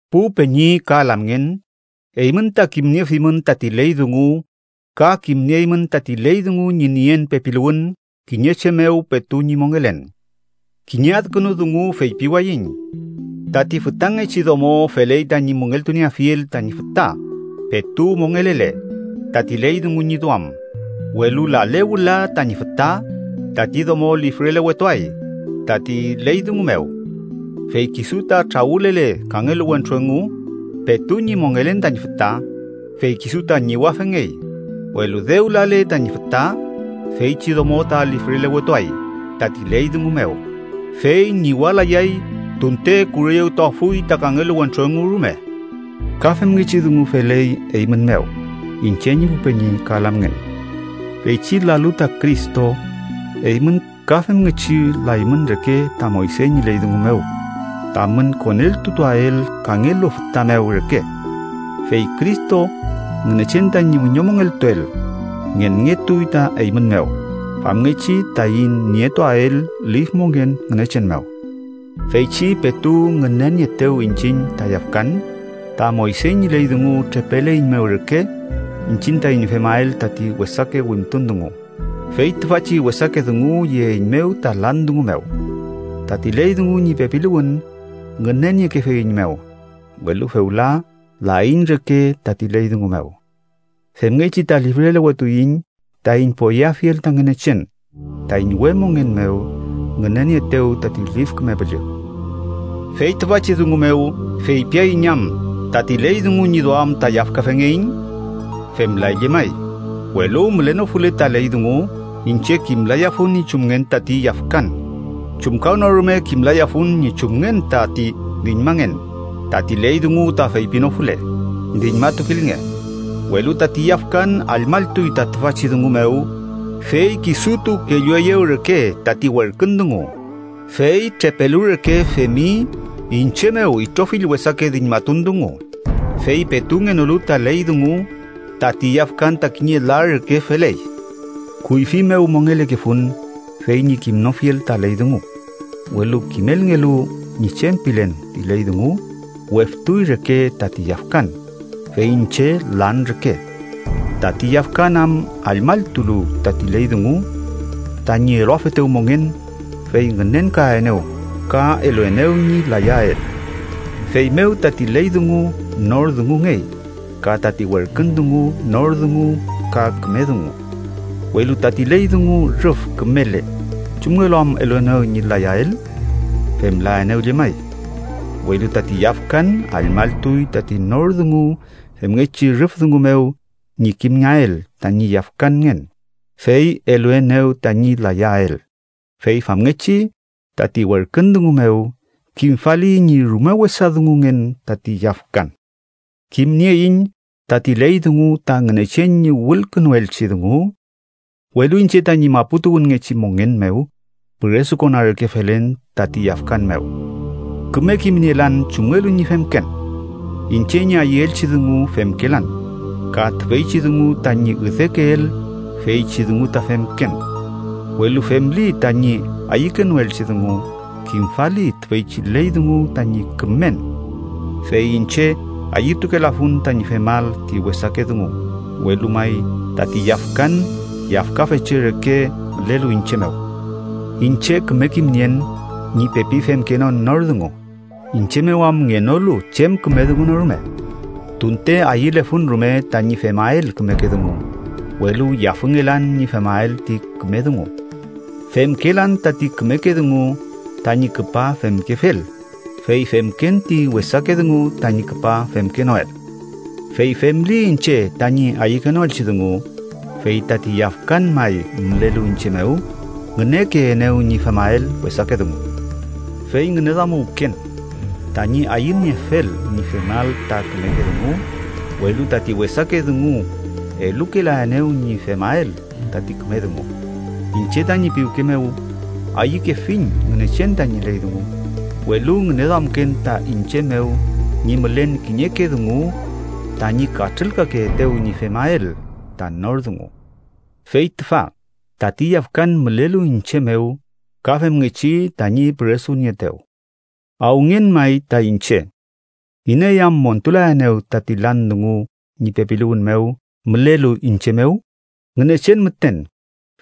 Pu peñi ka lamngen, eymün ta kimniefimün tati ley dungu, ka kimnieymün tati ley dungu ñi nien pepiluwün kiñe che mew petu ñi mongelen. Kiñe adkünu dungu feypiwayiñ. Tati fütangechi domo feley tañi müngeltunieafiel tañi füta, petu mongelele, tati ley dungu ñi duam. Welu lale wüla tañi füta, tati domo lifrelewetuay tati ley dungu mew. Fey ta kisu trawülele kangelu wentru engu petu ñi mongelen tañi füta, fey kisu ta ñiwafengey, welu dew lale tañi füta, feychi domo ta lifrelewetuay tati ley dungu mew, fey ñiwalayay tunte kureyewtuafuy ta kangelu wentru engu rume. Ka femngechi dungu feley eymün mew, iñche ñi pu peñi ka lamngen. Feychi lalu ta Cristo, eymün ka femngechi laymün reke ta Moyse ñi ley dungu mew, tamün koneltutuael kangelu füta mew reke. Fey Cristo, Ngünechen tañi wiñomongeltuel, ngenngetuy ta eymün mew, famngechi taiñ nietuael lif mongen Ngünechen mew. Feychi petu ngünenieetew iñchiñ ta yafkan, ta Moyse ñi ley dungu trepeleiñmew reke iñchiñ taiñ femael tati wesake wimtun dungu, fey tüfachi wesake dungu yeeiñmew ta lan dungu mew. Tati ley dungu ñi pepiluwün ngüneniekefeiñmew, welu fewla laiñ reke tati ley dungu mew. Femngechi ta lifrelewetuiñ taiñ poyeafiel ta Ngünechen taiñ we mongen mew ngünenieetew tati Lif Küme Püllü. ¿Fey tüfachi dungu mew feypiaiñ am tati ley dungu ñi duam ta yafkafengeiñ? ¡Femlay llemay! Welu mülenofule ta ley dungu, iñche kimlayafun ñi chumngen tati yafkan. Chumkawnorume kimlayafun ñi chumngen tati diñmangen tati ley dungu ta feypinofule: “Diñmatukilnge.” Welu tati yafkan allmalltuy ta tüfachi dungu mew, fey kisutu kellueyew reke tati werkün dungu, fey trepelu reke femi iñche mew itrofill wesake diñmatun dungu. Fey petu ngenolu ta ley dungu, tati yafkan ta kiñe la reke feley. Kuyfi mew mongelekefun fey ñi kimnofiel ta ley dungu, welu kimelngelu ñi chem pilen ti ley dungu, weftuy reke tati yafkan, fey iñche lan reke tati yafkan am allmalltulu tati ley dungu. Tañi eluafetew mongen, fey ngünenkaenew ka eluenew ñi layael. Feymew tati ley dungu nor dungungey, ka tati werkün dungu nor dungu ka küme dungu. Welu tati ley dungu rüf kümele, ¿chumngelu am eluenew ñi layael? ¡Femlaenew llemay! Welu tati yafkan allmalltuy tati nor dungu femngechi rüf dungu mew ñi kimngeael tañi yafkanngen, fey eluenew tañi layael. Fey famngechi, tati werkün dungu mew, kimfali ñi rume wesa dungungen tati yafkan. Kimnieiñ tati ley dungu ta Ngünechen ñi wülkünuelchi dungu, welu iñche tañi mapu tuwünngechi mongen mew püresukona reke felen tati yafkan mew. Küme kimnielan chumngelu ñi femken. Iñche ñi ayüelchi dungu femkelan, ka tüfeychi dungu tañi üdekeel, feychi dungu ta femken. Welu femli tañi ayükenoelchi dungu, kimfali tüfeychi ley dungu tañi kümen. Fey iñche ayütukelafun tañi femael ti wesake dungu, welu may tati yafkan yafkafeche reke mülelu iñche mew. Iñche küme kimnien ñi pepi femkenon nor dungu, iñche mew am ngenolu chem küme dungu no rume. Tunte ayülefun rume tañi femael kümeke dungu, welu yafüngelan ñi femael ti küme dungu. Femkelan tati kümeke dungu tañi küpa femkefel, fey femken ti wesake dungu tañi küpa femkenoel. Fey femli iñche tañi ayükenoelchi dungu, fey tati yafkan may mülelu iñche mew ngünekeenew ñi femael wesake dungu. Fey ngüneduamuwken tañi ayüniefel ñi femael ta kümeke dungu, welu tati wesake dungu elukelaenew ñi femael tati küme dungu. Iñche tañi piwke mew ayükefiñ Ngünechen tañi ley dungu, welu ngüneduamken ta iñche mew ñi mülen kiñeke dungu tañi katrülkakeetew ñi femael ta nor dungu. Fey tüfa tati yafkan mülelu iñche mew ka femngechi tañi püresunieetew. ¡Awüngen may ta iñche! ¿Iney am montulaenew tati lan dungu ñi pepiluwün mew mülelu iñche mew? Ngünechen müten,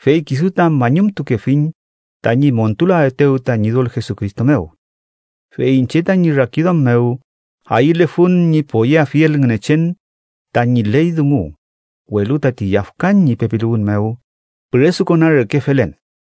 fey kisu ta mañumtukefiñ, tañi montulaetew ta Ñidol Jesucristo mew. Fey iñche tañi rakiduam mew ayülefun ñi poyeafiel Ngünechen tañi ley dungu, welu tati yafkan ñi pepiluwün mew püresukona reke felen.